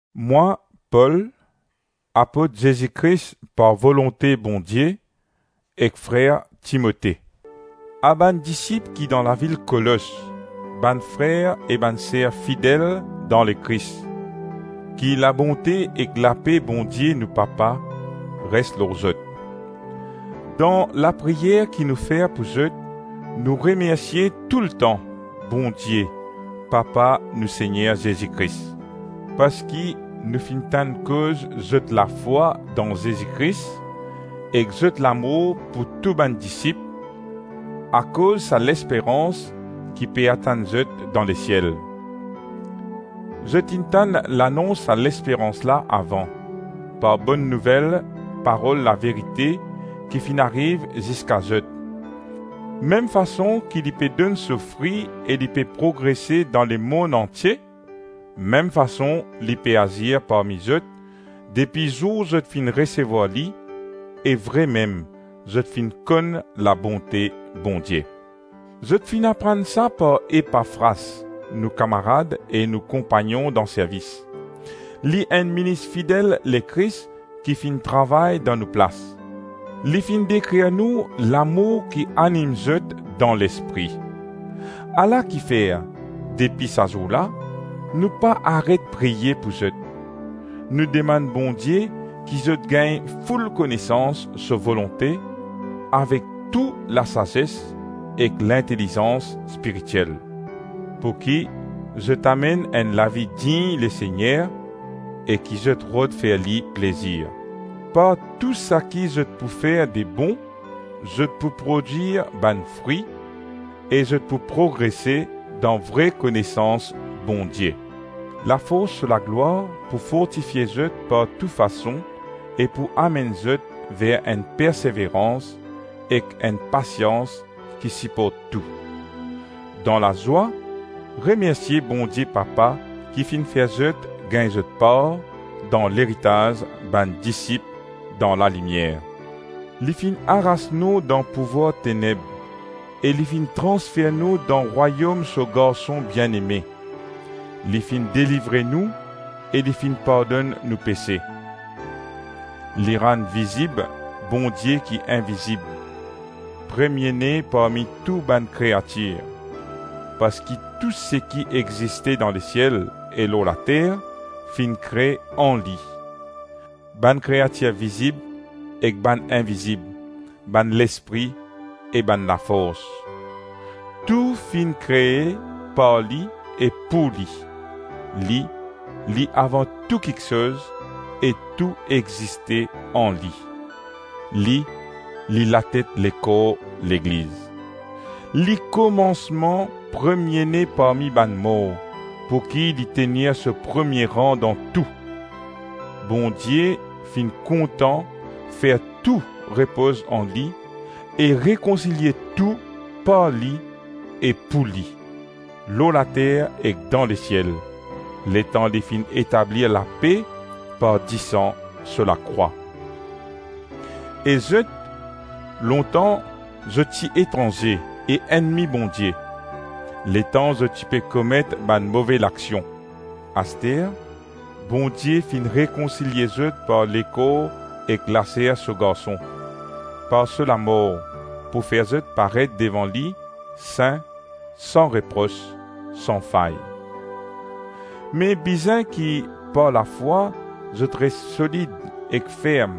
Mwa Pol, apot Zezi Kris par volonte Bondie, ek frer Timote. A bann disip ki dan lavil Kolos, bann frer e bann ser fidel dan Lekris: Ki labonte ek lape Bondie nou Papa res lor zot. Dan lapriyer ki nou fer pou zot, nou remersie toultan Bondie, Papa nou Segner Zezi Kris, parski nou finn tann koz zot lafwa dan Zezi Kris ek zot lamour pou tou bann disip, akoz sa lesperans ki pe atann zot dan lesiel; zot inn tann lanons sa lesperans la avan, par Bonn Nouvel, parol laverite ki finn ariv ziska zot; mem fason ki li pe donn so fri e li pe progrese dan lemonn antie, mem fason li pe azir parmi zot depi zour zot finn resevwar li e vremem zot finn konn labonte Bondie. Zot finn aprann sa par Epafras, nou kamarad e nou konpagnon dan servis. Li enn minis fidel Lekris ki finn travay dan nou plas. Li finn dekrir nou lamour ki anim zot dan Lespri. Ala kifer, depi sa zour la, nou pa aret priye pou zot. Nou demann Bondie ki zot gagn foul konesans so volonte avek tou lasazes ek lintelizans spiritiel, pouki zot amenn enn lavi dign Lesegner, e ki zot rod fer li plezir. Par tou saki zot pou fer de bon, zot pou prodwir bann fri e zot pou progrese dan vre konesans Bondie. Lafors so laglwar pou fortifie zot par tou fason e pou amenn zot ver enn perseverans ek enn pasians ki siport tou. Dan lazwa, remersie Bondie Papa ki finn fer zot gagn zot par dan leritaz bann disip dan lalimier. Li finn aras nou dan pouvwar teneb e li finn transfer nou dan Rwayom so Garson bieneme; li finn delivre nou e li finn pardonn nou pese. Li rann vizib Bondie ki invizib, Premie-ne parmi tou bann kreatir, parski tou seki existe dan lesiel e lor later finn kre an li, bann kreatir vizib ek bann invizib, bann Lespri e bann Lafors. Tou finn kre par li ek pou li, li, li avan tou kiksoz e tou existe an li, li, li latet lekor Legliz. Li komansman, Premie-ne parmi bann mor, pouki li tenir so premie ran dan tou. Bondie finn kontan fer tou repoz an li e rekonsilie tou par li e pou li, lor later ek dan lesiel, letan li finn etablir lape par disan so lakrwa. E zot, lontan, zot ti etranze e ennmi Bondie, letan zot ti pe komet bann move laksion, aster Bondie finn rekonsilie zot par lekor ek laser so Garson, par so lamor, pou fer zot paret devan li, sin, san repros, san fay. Me bizin ki, par lafwa, zot res solid ek ferm,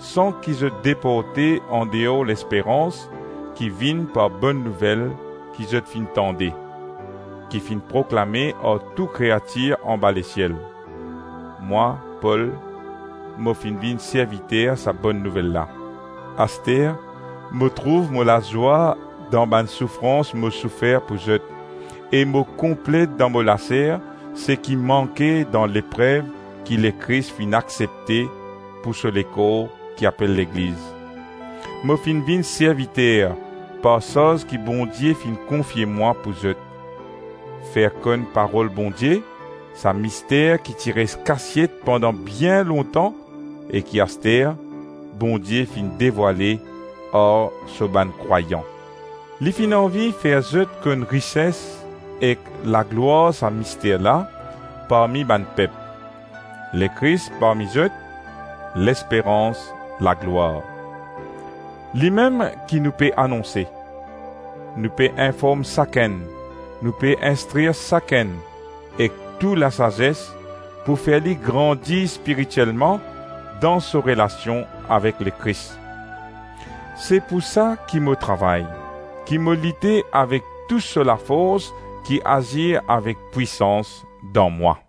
san ki zot deporte andeor lesperans ki vinn par Bonn Nouvel ki zot finn tande, ki finn proklame ar tou kreatir anba lesiel. Mwa Pol mo finn vinn serviter sa Bonn Nouvel la. Aster mo trouv mo lazwa dan bann soufrans mo soufer pou zot e mo konplet dan mo laser seki manke dan leprev ki Lekris finn aksepte pou so lekor ki apel Legliz; mo finn vinn serviter par sarz ki Bondie finn konfie mwa pou zot: fer konn Parol Bondie, sa mister ki ti res kasiet pandan bien lontan e ki aster Bondie finn devwale ar so bann krwayan. Li finn anvi fer zot konn rises ek laglwar sa mister la parmi bann pep: Lekris parmi zot, lesperans laglwar! Limem ki nou pe anonse; nou pe inform sakenn, nou pe instrir sakenn ek tou lasazes, pou fer li grandi spiritielman dan so relasion avek Lekris. Se pou sa ki mo travay, ki mo lite avek tou so lafors ki azir avek pwisans dan mwa.